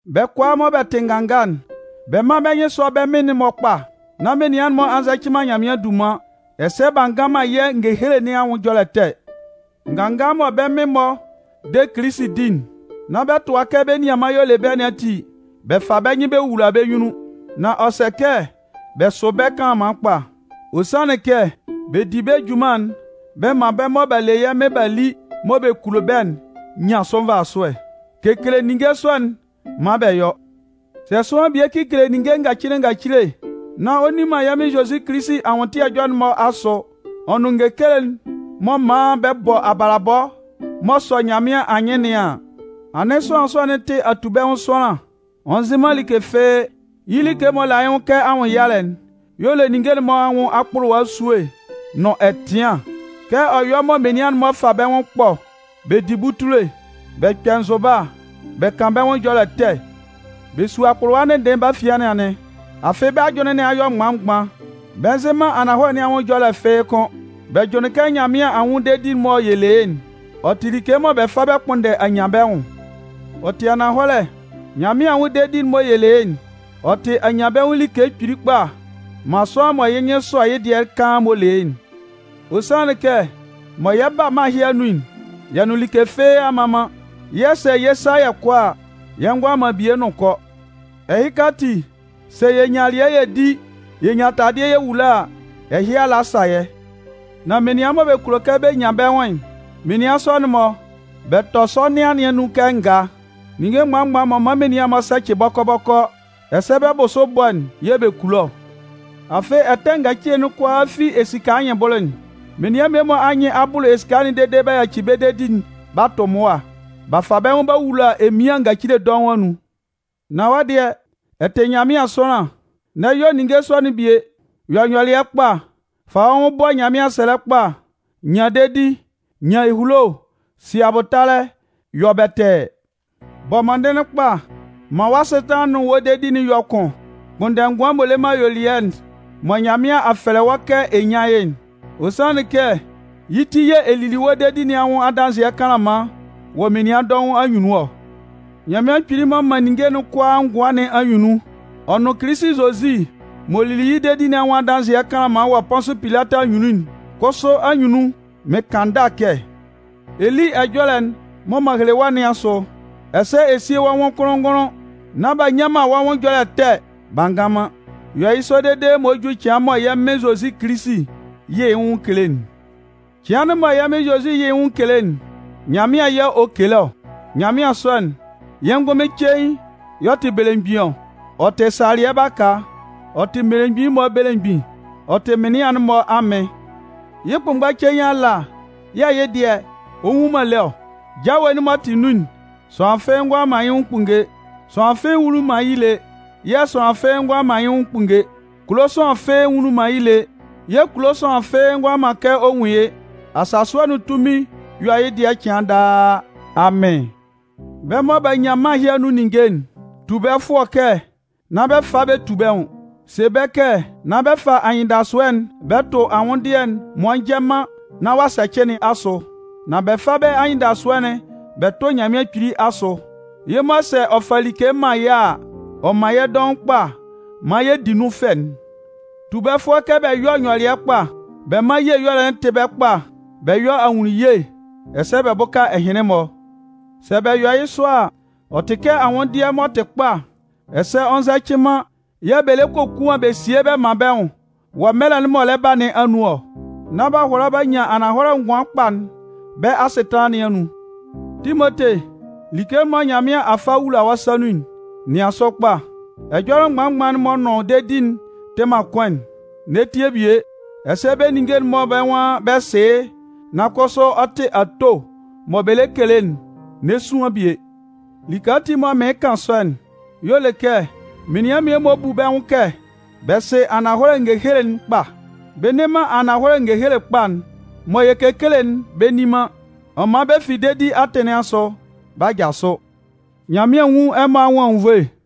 Bɛ́ kʋalaa mɔ bɛ tɩ nganga'n, bɛ mán bɛ́ nyɩn sɔ́ bɛ́ mɩn-mɔ kpa, nán menian'n-mɔ a nzɛcɩ man Nyanmɩan dunman, ɛsɛ b'a ngan man yɛ́ ngehele nɩn nwʋn ɛjɔlɛ ɛtɛ. Nganga mɔ bɛ́ mɩn-mɔ de Kilisi di'n, nán bɛ tʋa kɛ bɛ́ nianman y'ɔ le bɛ́ nɩn ati, bɛ fa bɛ́ nyɩn bɛ wowula bɛ́ nyunnun. Nan ɔ sɛ kɛ bɛ sʋ bɛ́ kanlanman kpa. Ɔ sanlɩn kɛ bɛ di bɛ́ junman'n bɛ man bɛ́ mɔ b'a le yɛ́ Mɩn b'a li mɔ bɛ kulo bɛ́'n nyan sʋ nvasʋɛ. Kekele ninnge sɔ'n maan bɛ yɔ́. Sɛ sʋanlan bie kekele ninnge ngacile ngacile, nán ɔ nni man yɛ́ Mɩn Zozi Kilisi anwʋntɩɛ ɛjɔlɛ'n-mɔ asʋ ɔ nʋn ngehele'n m'ɔ man bɛ bɔ abalabɔ m'ɔ sɔ Nyanmɩan anyɩn nɩn an, anɩn sʋanlan sɔ'n tɩ atubɛnwʋn sʋanlan. Ɔ nzɩ man like fɩ́ɩ́. Yɩ́ like m'ɔ la yɩ́ nwʋn kɛ anwʋnnyalɛ'n y'ɔ le ninnge'n-mɔ anwʋn akpʋlʋwa esue nʋn ɛtɩan'n. Kɛ ɔ yɔ mɔ menian'n-mɔ fa bɛ́ nwʋn ɛkpɔ bɛ di butule, bɛ kpɛ nzʋba, bɛ kan bɛ́ nwʋn ɛjɔlɛ ɛtɛ, bɛ su akpʋlʋwa ndɩnndɩɩn bɛ́ afian nɩn anɩn. Afɩ bɛ́ ajʋnlɩn nɩn a yɔ mgban-mgban, bɛ nzɩ man ananhɔlɛ nɩn anwʋn ɛjɔlɛ fɩ́ɩ́ kʋ́n. Bɛ jʋnlɩn kɛ Nyanmɩan anwʋn dedi'n mɔ yɛ le yɩ́'n, ɔ tɩ like mɔ bɛ fa bɛ kpʋnndɛ anyanbɛnwʋn. Ɔ tɩ ananhɔlɛ, Nyanmɩan anwʋn dedi'n mɔ yɛ le yɩ́'n, ɔ tɩ anyanbɛnwʋn like kpili kpa man sʋanlan mɔ yɩ́ nyɩn sɔ yɩ́ dɩɛ kaan m'ɔ le yɩ́'n. Ɔ sanlɩn kɛ mɔ yɛ 'ba mân ɛhɩ anun'n, yɛ nʋn like fɩ́ɩ́ a mma man, yɛ̂ sɛ yɛ 'sa yɛ kɔ a, yɛ ngʋala man bie nʋn kɔ. Ɛhɩka ati, sɛ yɛ nyan alɩɛ yɛ di, yɛ nyan taladɩɛ yɛ wula a, ɛhɩ ala sa yɛ́. Nan menian mɔ bɛ kulo kɛ bɛ nyan bɛ́ nwʋn'n, menian sɔ'n-mɔ, bɛ tɔ sɔnɩan nɩn anun kɛ ngaa. Ninnge mgban-mgban m'ɔ man menian sɛcɩ bɔkɔ-bɔkɔ, ɛsɛ bɛ́ bʋsʋ bɔ'n yɛ̂ bɛ kulo ɔ. Afɩ ɛtɛ ngacile'n kʋalaa fi esika anyɩnbʋlʋ'n. Menian mmie-mɔ anyɩn a bʋlʋ esika'n dede b'a yaci bɛ́ dedi'n b'a tʋ mʋa, b'a fa bɛ́ nwʋn b'a wula emian ngacile dɔʋn anun. Nan wɔ́ dɩɛ, ɛ tɩ Nyanmɩan sʋanlan, n'ɛ yɔ ninnge sɔ'n-mɔ bie. Yɔ nyɔlɩɛ kpa. Fa wɔ́ nwʋn bɔ Nyanmɩan sɛlɛ kpa, nyan dedi, nyan ehulo, si abʋtalɛ, yɔ bɛtɛɛ. Bɔ mɔndɩnlɩn kpa, man wɔ́ asɩtanlan'n nʋn wɔ́ dedi'n yɔ́ kʋn. Kpʋnndɛ ngʋan m'ɔ le man ayuelɩɛ'n mɔ Nyanmɩan a fɛlɛ wɔ́ kɛ ɛ nyán yɩ́'n. Ɔ sanlɩn kɛ yɩ́ ti yɛ̂ ɛ lili wɔ́ dedi nɩn anwʋn adanzɩɛ kanlanman wɔ menian dɔʋn anyunnun ɔ. Nyanmɩan Kpili m'ɔ man ninnge kʋalaa ngʋan nɩn anyunnun, ɔ nʋn Kilisi Zozi m'ɔ lili yɩ́ dedi nɩn anwʋn adanzɩɛ kanlanman wɔ Pʋnsʋ Pilatɩ anyunnun'n kʋsʋ anyunnun, mɩn kan ndâ kɛ ɛ lí ɛjɔlɛ'n mɔ m'an hele wɔ́ nɩn asʋ, ɛsɛ ɛ síe wɔ́ nwʋn kʋnlʋn-ngʋnlʋn nán b'a nnyan man wɔ́ nwʋn ɛjɔlɛ ɛtɛ b'a ngan man. Yɔ yɩ́ sɔ dede m'ɔ jú cɩan mɔ yɛ́ Mɩn Zozi Kilisi 'yɩ yɩ nwʋn kele'n. Cɩan'n mɔ yɛ́ Mɩn Zozi 'yɩ yɩ nwʋn kele'n, Nyanmɩan yɛ̂ ɔ 'kele ɔ. Nyanmɩan sɔ'n, yɩ́ ngʋnmɩn cein y'ɔ tɩ Belemgbin ɔ, ɔ tɩ salɩɛ baka, ɔ tɩ mmelemgbin'n-mɔ Belemgbin, ɔ tɩ mɩnlɩan'n-mɔ Amɩn. Yɩ́ kʋnmgba cein ala yɛ̂ yɩ́ dɩɛ ɔ nwu man lé ɔ. Jawe'n m'ɔ tɩ nun'n, sʋanlan fɩ́ɩ́ ngʋala man yɩ́ nwʋn kpunnge. Sʋanlan fɩ́ɩ́ nwunlin man yɩ́ lé, yɛ̂ sʋanlan fɩ́ɩ́ ngʋala man yɩ́ nwʋn kpunnge. Kulo sʋanlan fɩ́ɩ́ nwunlin man yɩ́ lé, yɛ̂ kulo sʋanlan fɩ́ɩ́ ngʋala man kɛ ɔ nwun yɩ́. Asasʋɛ nʋn tunmin yɔ́ yɩ́ dɩɛ cɩan daa! Amɩn! Bɛ́ mɔ b'a nyan mân ɛhɩ anun ninnge'n, tu bɛ́ fʋɔ kɛ nán bɛ fa bɛ tu bɛ́ nwʋn. Se bɛ́ kɛ nán bɛ fa bɛ́ anyɩndasʋɛ'n bɛ tʋ anwʋndɩɛ'n m'ɔ njɛ man nán ɔ'a sɛcɩ nɩn asʋ. Nan bɛ fá bɛ́ anyɩndasʋɛ'n bɛ tʋ́ Nyanmɩan Kpili asʋ. Yɩ́ mɔ sɛ ɔ 'fa like man yɛ́ a, ɔ man yɛ́ dɔʋn kpa maan yɛ di nun fɛ'n. Tu bɛ́ fʋɔ kɛ bɛ yɔ́ nyɔlɩɛ kpa, bɛ mán ye ɛyɔlɛ'n tɩ́ bɛ́ kpa, bɛ yɔ́ ahunnunye, ɛsɛ bɛ bʋ́ka ɛhɩnlɩn-mɔ. Sɛ bɛ yɔ yɩ́ sɔ a, ɔ tɩ kɛ anwʋnndɩɛ m'ɔ tɩ kpa, ɛsɛ ɔ nzɛcɩ man yɛ̂ bɛ lɛ kokuan bɛ sie bɛ man bɛ́ nwʋn wɔ mɛlɛ'n m'ɔ lɛ ba nɩn anun ɔ, nán b'a hʋala b'a nyan ananhɔlɛ ngʋan kpa'n bɛ́ asɩtanlan nɩn anun. Timote, like'n mɔ Nyanmɩan a fa a wula wɔ́ sa nun'n, nɩan sʋ kpa. Ɛjɔlɛ mgban-mgban'n m'ɔ nʋn dedi'n tɩ man kʋn'n, n'ɛ tie bie, ɛsɛ bɛ́ ninnge'n mɔ bɛ́ nwan bɛ sɩ yɩ́ nan kʋsʋ ɔ tɩ ato mɔ bɛ lɛ kele'n, n'ɛ suan bie. Like ati m'ɔ man mɩɩn kan sɔ'n, y'ɔ le kɛ menian mmie-mɔ bu bɛ́ nwʋn kɛ bɛ sɩ ananhɔlɛ ngehele'n kpa, bɛ nne man ananhɔlɛ ngehele kpa'n mɔ yɛ kekele'n bɛ nni man. Ɔ man bɛ fi dedi atɩn nɩn asʋ b'a jasʋ. Nyanmɩan nwún ɛmɔ anwʋn anwunnvoe.